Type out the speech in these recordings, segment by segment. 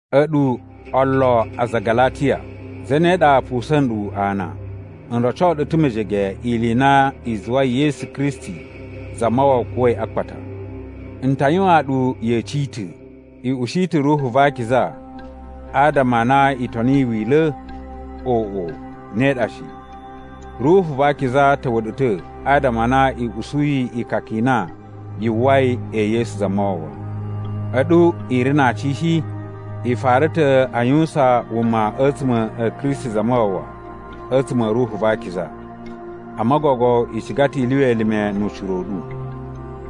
A̱ɗu, olo aza a Galatiya! Zane ɗa pusa̱n nɗu ana? N roco ɗu ta̱ mejege ili i na i zuwai Yesu Kristi Zamawawa kuwa̱i a akpata. N ta yuwan ɗu yeci i ta̱: I ushi ta̱ Ruhu va Akiza adama a na i toniyi Wila̱? Oꞌo, ne ɗa shi! Ruhu va Akiza ta̱wa̱ ɗu ta̱ adama a na i usuyi ikaka i na yu uwwai e Yesu Zamawawa. A̱ɗu i ri na aci shi? I fara ta̱ a yuwusan wuma a̱tsuma̱ a̱ Kristi Zamawawa a̱tsuma̱ a̱ Ruhu va Akiza, amma gogo i ciga ta̱ i lyuwa elime nu ucira u ɗu.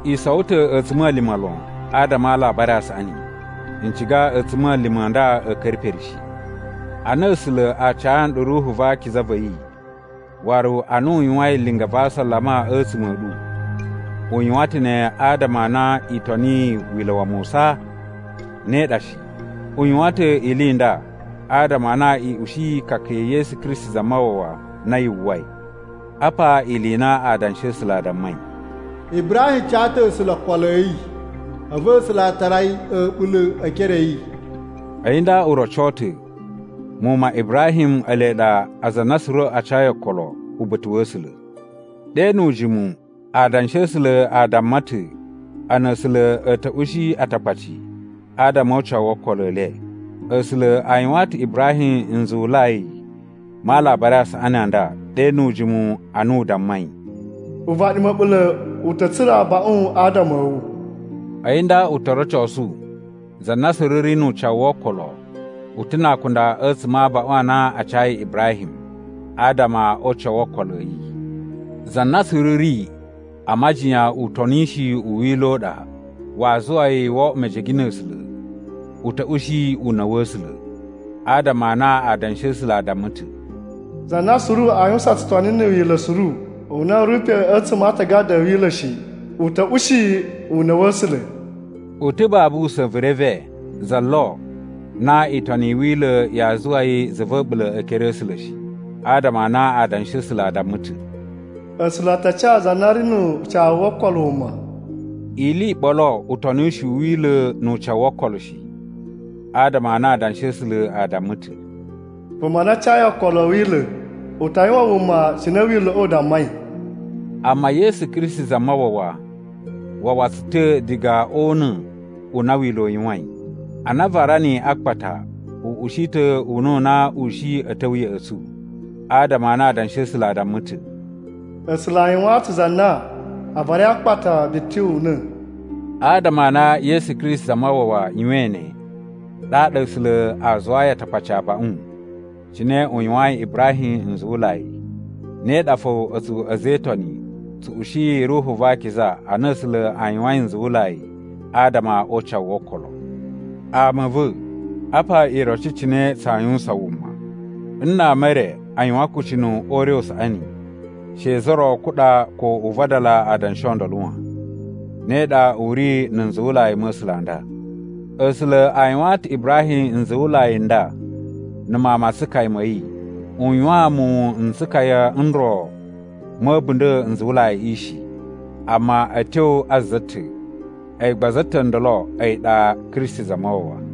I sowo ta̱ a̱tsuma̱lima̱ lon adama a Alabari a Saꞌani. N ciga a̱tsuma̱lima̱ a nda a̱ ka̱ra̱ pere shi. Ana A̱sula̱ a ca nɗu Ruhu va Akiza va̱ yi waru ana u yuwain linga va asalama a̱tsuma̱ a̱ ɗu, u yuwan ta̱ ne adama a na i toniyi Wila̱ wa Musa? Ne ɗa shi! U yuwan ta̱ ili i nda adama a na i ushiyi ikaka ya̱ Yesu Kristi Zamawawa na yu uwwai. Apa ili i na Adanshi a̱ A̱sula̱ a dammai: “Ibrahim ca ta̱ A̱sula̱ okolo a̱ yi, a̱vu A̱sula̱ a tara yi a̱ɓula̱ e ekere a̱ yi.” A̱yi nda u roco ta̱ muwun ma Ibrahim ele ɗa aza a na suru a cayi okolo uba̱ta̱ wa̱ A̱sula̱. Ɗe nu ujimu Adanshi a̱ A̱sula̱ a damma ta̱ a na A̱sula̱ a̱ ta̱ ushi Atakpaci adama o ucawu wo okolo e le. A̱sula̱ a yuwaan ta̱ Ibrahim nzuwulai ma Alabari a Saꞌani a nda ɗe nu ujimu ana u dammai, “Uvaɗi ma̱ɓula̱ u ta̱ tsura̱ abaꞌun adama a̱ wu.” A̱yi nda u to rocosu za na suru ri nu ucawu wo okolo, u ta̱ na akunda a̱tsuma̱ a abaꞌun a na a cayi Ibrahim adama o ucawu wo okolo a̱ yi. Za na suru ri a majiyan utonishi u Wila̱ u ɗa waa zuwa yi wo oꞌwo mejege na̱ A̱sula̱, u ta̱ ushi una̱ wa̱ A̱sula̱. Adama a na Adanshi a̱ A̱sula̱ a damma ta̱, “Za na suru aa yuwusan tsutoni na̱ Wila̱ suru u na u ri pe a̱tsuma̱ a Aatagada a̱ Wila̱ shi, u ta̱ ushi una̱ wa̱ A̱sula̱.” U ta̱ babu usa̱n vu reve za lo, na itoni i Wila̱ yaa zuwa yi za va̱ a̱ɓula̱ e ekere a̱ A̱sula̱ shi, adama a na Adanshi a̱ A̱sula̱ a damma ta̱, “A̱sula̱ a ta ca za na ri nu ucawu wo okolo wuma.” Ili i ɓolo utonishi u Wila̱ nu ucawu wo okolo shi, adama a na Adanshi a̱ A̱sula̱ a damma ta̱, “Vuma na cayi okolo a̱ Wila̱ u ta yuwan wuma cine Wila̱ꞌa̱ u dammai.” Amma Yesu Kristi Zamawawa wawa tsu ta̱ diga o una̱ u na Wila̱ u yuwain. Ana a vara niyi a akpata u ushi ta̱ una̱ u na u shi a̱ ta̱wa̱ ya̱ꞌa̱ tsu. Adama a na Adanshi a̱ A̱sula̱ a damma ta̱, “A̱sula̱ a yuwaan ta̱ za na a varai a akpata biti una̱.” Adama a na Yesu Kristi Zamawawa yuwain ne, ɗaɗa A̱sula̱ a zuwayi Atakpaci abaꞌun cine u yuwayin Ibrahim nzuwulai, ne ɗa fo a̱tsu a̱za̱ e Itoni tsu ushiyi Ruhu va Akiza a na A̱sula̱ a yuwain nzuwulai adama o ucawu wo okolo. Ama a̱ va̱, apa iroci cine tsaa yuwusan wuma: Nna ama e re a yuwan akucunu o ure u saꞌani, she za ro kuɗa ko u vadala adanshi o ndolo wan. Ne ɗa u ri na̱ nzuwulai ma̱ A̱sula̱ n nda. A̱sula̱ a yuwaan ta̱ Ibrahim nzuwulai n nda na̱ mawun ma tsukaya ma̱ yi. U yuwaan muwun n tsukaya n ro ma̱ a̱bunda̱ nzuwulaiꞌi shi, amma a̱ tyo a za ta̱, a̱yi gba za ta̱ ndolo a̱yi ɗa Kristi Zamawawa.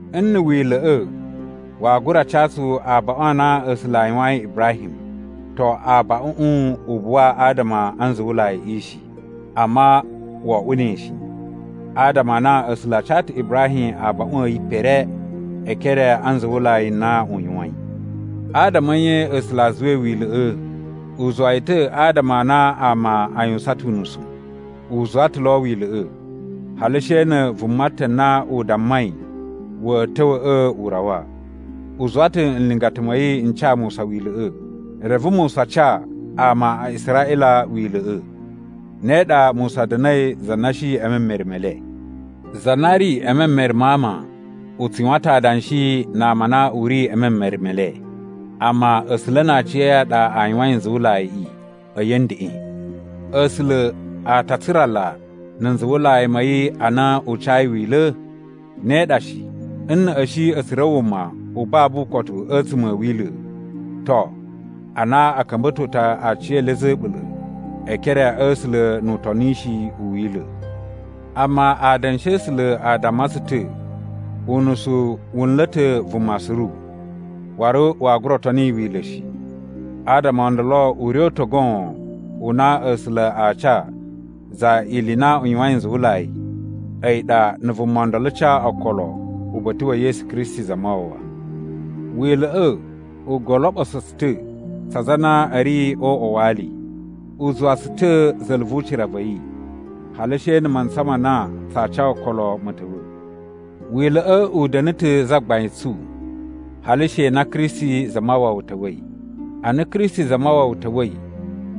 Nna̱ Wila̱ꞌa̱ waa gura ca tsu abaꞌun a na A̱sula̱ a yuwayin Ibrahim, to, abaꞌuꞌun u buwa adama a nzuwulaiꞌi shi. Amma wo oꞌwo ne shi, adama a na A̱sula̱ a ca ta̱ Ibrahim abaꞌun a̱ yi pere e ekere a nzuwulai n na u yuwain. Adama a̱ nye A̱sula̱ a zuwai Wila̱ꞌa̱? U zuwa yi ta̱ adama a na ama a yuwusan ta̱ unusu. U zuwa ta̱ lo Wila̱ꞌa̱, hali she na̱ vuma ta̱ na u dammai wa̱a̱ ta̱wa̱ꞌa̱ u rawa. U zuwa ta̱ nlingata ma̱ yi n ca Musa Wila̱ꞌa̱, reve Musa ca ama a Israꞌila Wila̱ꞌa̱. Ne ɗa Musa da̱na̱i za na shi e memere me le. Za na ri e memere ma ama u tsu yuwan ta̱ adanshi na ama a na u ri e memere me le, amma A̱sula̱ na aciya̱yi a ɗa a yuwain nzuwulaiꞌi a̱yi a̱ ndeꞌen. A̱sula̱ a ta a tsurala na̱ nzuwulai ma̱ yi ana u cayi Wila̱? Ne ɗa shi. Nna̱ a̱ shi a̱ tsura̱ wuma u babu ukotu a̱tsuma̱ a̱ Wila̱, to, a na a̱ ka̱mba̱to ta̱ aciyele a̱za̱ a̱ a̱ɓula̱ e ekere a̱ A̱sula̱ nu utonishi u Wila̱. Amma Adanshi a̱ A̱sula̱ a damma tsu ta̱ unusu wu nla̱ ta̱ vuma suru, waru waa gura toni Wila̱ shi. Adama o ndolo ure u ta̱ goon u na A̱sula̱ aa ca za ili i na u yuwain nzuwulai a̱yi ɗa na̱ vuma ndolo ca okolo uba̱ta̱ wa̱ Yesu Kristi Zamawawa. Wila̱ꞌa̱ u goloɓuso tsu ta̱ tsa aza a na a̱ ri o uꞌwa wa ali. U zuwa tsu ta̱ za̱la̱ vu ucira va̱ yi, hali she na̱ mantsa ma na tsaa ca okolo ma̱ ta̱wa̱. Wila̱ꞌa̱ u da̱na̱ ta̱ zagbain tsu, hali she na Kristi Zamawawa ta̱wa̱i. Ana Kristi Zamawawa ta̱wa̱i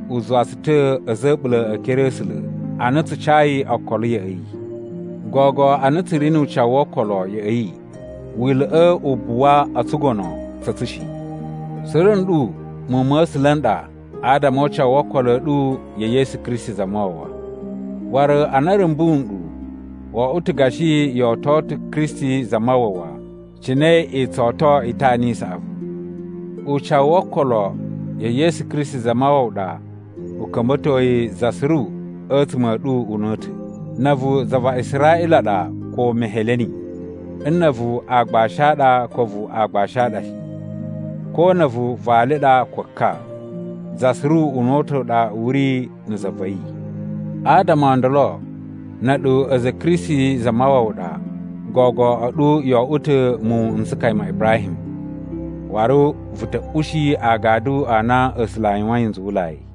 u zuwa tsu ta̱ a̱za̱ a̱ a̱ɓula̱ e ekere a̱ A̱sula̱ ana tsu cayi okolo ya̱ꞌa̱ yi. Gogo a na tsu ri nu ucawu wo okolo ya̱ꞌa̱ yi, Wila̱ꞌa̱ u buwa o tsugono tsa̱ tsu shi. Suru nɗu muwun ma̱ A̱sula̱ n ɗa adama o ucawu wo okolo a̱ ɗu ya̱ Yesu Kristi Zamawawa. Waru ana a̱ rumbu nɗu, wo oꞌwo ta̱ gashi yo oto ta̱ Kristi Zamawawa cine i tsu oto itana i saꞌavu. Ucawu wo okolo ya̱ Yesu Kristi Zamawawa ɗa u ka̱mba̱toi za suru a̱tsuma̱ a̱ ɗu una̱ta̱: na̱ a̱vu za va Israꞌila ɗa ko Meheleni, nna̱ a̱vu aagbashi a ɗa ko a̱vu aagbashi a ɗa shi, ko na̱ a̱vu vali ɗa ko ka, za suru una̱ta̱ u ɗa u ri na̱ za va̱ yi. Adama o ndolo na̱ a̱ɗu a̱za̱ a̱ Kristi Zamawawa ɗa, gogo a̱ɗu yo oꞌwo ta̱ muwun n tsukaya ma Ibrahim, waru vu ta̱ ushi agadu a na A̱sula̱ a yuwain nzuwulai.